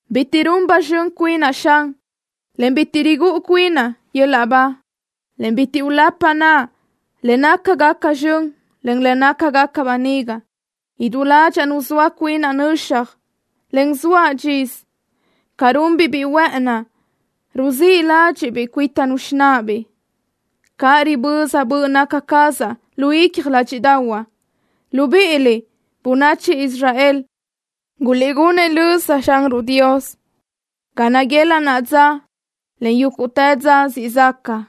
Bitiʼ run ba zxön cuinaʼ, Xan, en bitiʼ rigúʼu cuinaʼ yöl-laʼ ba, en bitiʼ ulapaʼ naʼa le nácagaca zxön, en le nácagaca böniga. Idú ládxaʼa nuzóa cuinaʼ nöxaj, en zoaʼ dxisö. Ca runbiʼ biʼi huë́ʼëni ruzíʼ ládxiʼbiʼ cuítanu xináʼabiʼ, caʼ riböza böʼ naca cazaʼ lu icja ládxiʼdaʼahuaʼ. ¡Libíʼiliʼ, bönachi Israel, guliʼgunëʼ löza Xanruʼ Dios ga naguelaʼ naʼa dza, en yúguʼtë dza siʼ zaca!